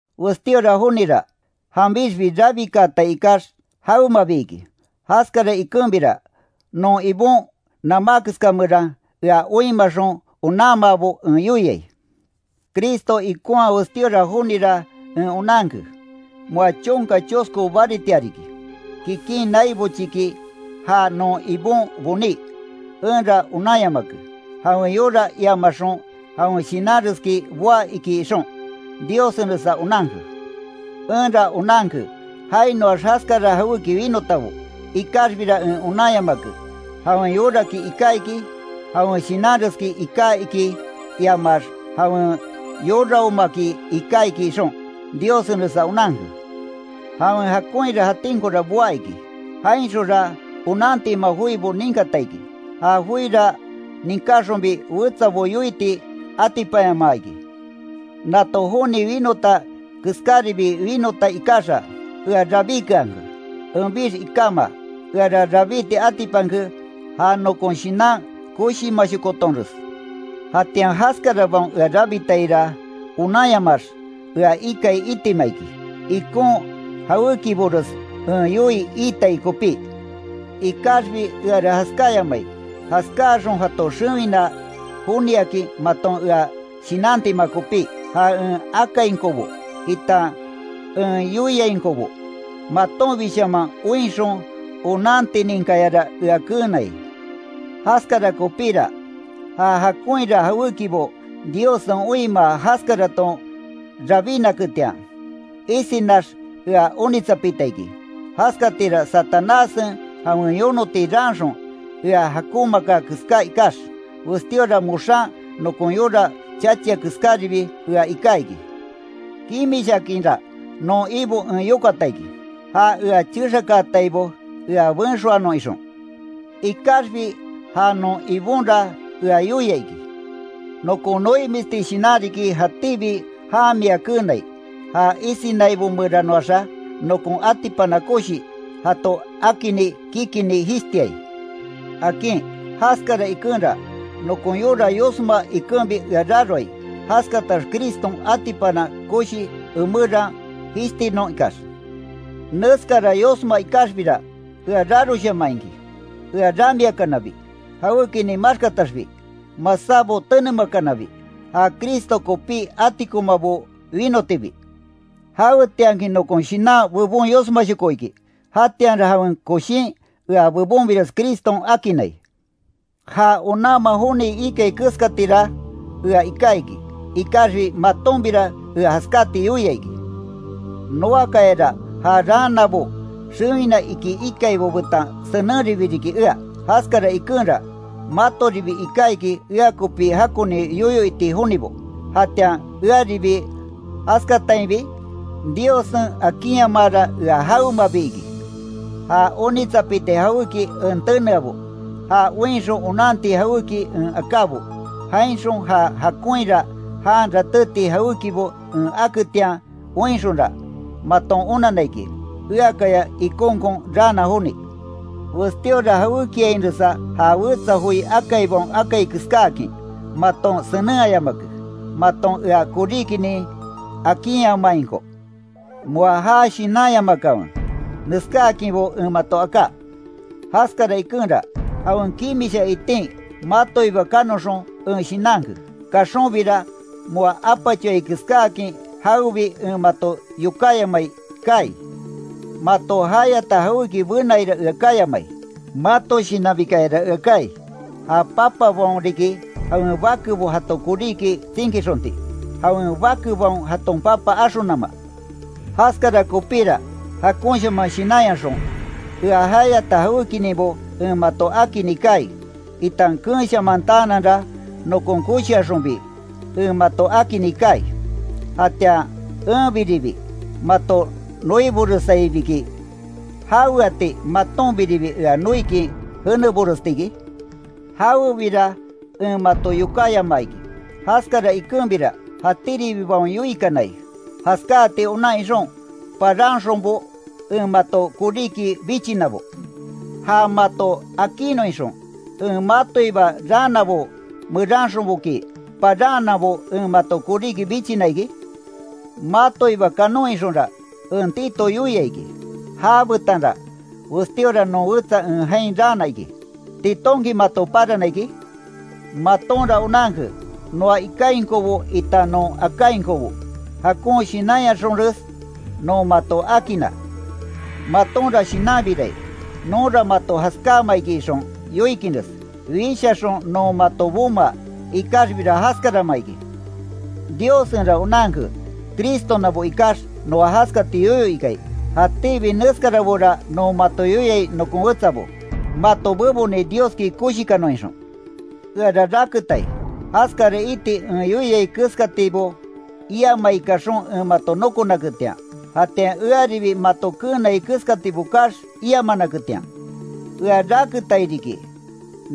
Westíora jonira, janbixbi rabikaatai ikax, jawemabi iki, jaskara ikenbira, non Ibon namá keska meran ea oinmaxon onanmaabo en yoiai. Cristo ikonhaa westíora jonira en onanke. Moa chonka chosko baritia riki, kikin nai bochiki já non Ibon boní, enra onanyamake, jawen yora iamaxon jawen shinanreski boá iki ixon, Diossenresa onanke. Enra onanke, jainoax jaskara jawéki winotabo, ikaxbira en onanyamake, jawen yoraki iká iki, jawen shinanreski iká iki iamax jawen yoraomaki iká iki ixon, Diossenresa onanke. Jawen jakonhira jatinkora boá iki, jainxonra onantima joibo ninkata iki, ja joira ninkáxonbi wetsabo yoiti atipanyamaa iki. Nato joni winota keskáribi winota ikaxa, ea rabíkeanke, enbix ikáma, eara rabíti atipanke ja nokon shinan koshimashokotonres. Jatian jaskarabaon ea rabitaira, onanyamaax, ea ikai itima iki, ikon jawékibores en yoii iitai kopí. Ikaxbi eara jaskáyamai, jaskáaxon jato xewina joniakin maton ea shinantima kopí. Ja en akainkobo, itan en yoiainkobo matonbishaman oinxon onantininkayara ea keenai. Jaskara kopíra, ja jakonhira jawékibo Diossen oinmaa jaskaraton rabínaketian, isinax ea onitsapita iki, jaskatira Satanássen jawen yonoti raanxon ea jakonmaaka keská ikax, westíora moxan nokon yora chachia keskáribi ea iká iki. Kimishaakinra non Ibo en yokata iki, ja ea chexakaataibo ea benxoanon ixon. Ikaxbi ja non Ibonra ea yoia iki: “Nokon noimisti shinan riki jatíbi jan mia keenai, ja isinaibo meranoaxa, nokon atipana koshi, jato akinni kikinni jishtiai”, akin. Jaskara ikenra, nokon yora yosma ikenbi ea raroai, jaskatax Criston atipana koshi emeran jishtinon ikax. Neskara yosma ikaxbira, ea raroshaman iki. Ea ramiakanabi, jawékinin maxkataxbi, masábo tenemakanabi, ja Cristo kopi atikomabo winotibi. Jawetianki nokon shinan bebon yosmashoko iki, jatianra jawen koshin ea bebonbires Criston akinnai. Ja onanma joni ikai keskatira, ea iká iki, ikaxbi matonbira ea jaskati yoia iki. Noakayara ja raanabo xewina iki ikaibo betan senenribi riki ea, jaskara ikenra, matoribi iká iki ea kopi jakoni yoyo iti jonibo, jatian earibi jaskatainbi, Diossen akinyamaara ea jawemabi iki. Ja onitsapiti jawéki en teneabo, ja oinxon onanti jawéki en akábo, jainxon ja jakonhira jan ratéti jawékibo en aketian oinxonra, maton onanna iki, eakaya ikonkon raana joni. Westíora jawékiainresa ja wetsa joi akaibaon akai keskáakin, maton senenhayamake, maton ea koríkinin akinyamainko. Moa ja shinanyamakanwe, neskáakinbo en mato aká. Jaskara ikenra, jawen kimisha itin matoiba kanoxon, en shinanke. Kaxonbira, moa apachoai keskáakin jawebi en mato yokáyamai kaai; mato jayata jawéki benaira ea kayamai, mato shinanbikayara ea kaai, ja papabaon riki, jawen bakebo jato koríki tsinkixonti, jawen bakebaon jaton papa axonama. Jaskara kopíra, jakonshaman shinanyaxon, ea jayata jawékininbo en mato akinni kaai, itan keenshamantaananra, nokon koshiaxonbi en mato akinni kaai. Jatian enbiribi, mato noiboresaibiki ¿Jaweati matonbiribi ea noikin jéneboresti iki? Jawebira, en mato yokáyamaa iki, jaskara ikenbira jatíribibaon yoikanai, jaskati onan ixon, paranxonbo en mato koríki bichinabo. ¿Ja mato akinnon ixon, en matoiba raanabo meranxonboki, paranhananbo en mato koríki bichina iki? Matoiba kanon ixonra, en Tito yoia iki, já betanra westíora non wetsa en jain raana iki ¿Titonki mato parana iki? Matonra onanke, noa ikainkobo itan non akainkobo, jakon shinanyaxonres non mato akinna. Matonra shinanbirai, nonra mato jaskáama iki ixon yoikinres, wishaxon non mato bomaa, ikaxbira jaskarama iki. Diossenra onanke, Cristonabo ikax noa jaskati yoyo ikai. Jatíbi neskarabora non mato yoiai nokon wetsabo, mato beboni Dioski koshikanon ixon. Eara raketai, jaskara iti en yoiai keskatibo iamai kaxon en mato nokonaketian, jatian earibi mato keenai keskatibo kaax, iamanaketian. Ea raketairibi riki,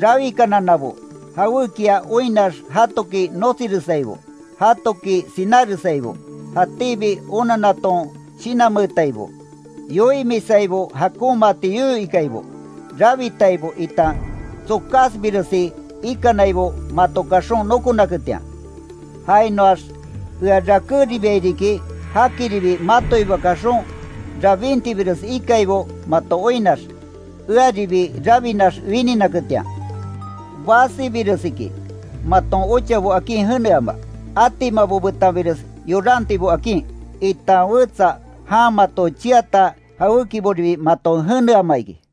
rawikananabo, jawékia oinnax jatoki notsiresaibo, jatoki sináresaibo, jatíbi onannaton shinanmeetaibo, yoimisaibo jakonmaati yoyo ikaibo, rabitaibo itan tsokásbiresi ikanaibo mato kaxon, nokonaketian. Jainoax ea rakéribiai riki, jakiribi matoiba kaxon rabintibires ikaibo mato oinnax, earibi rabinax wininaketian. Basibiresiki, maton ochabo akin jeneama, atimabo betanbires yorantibo akin, itan wetsa jan mato cheata jawékiboribi maton jeneama iki.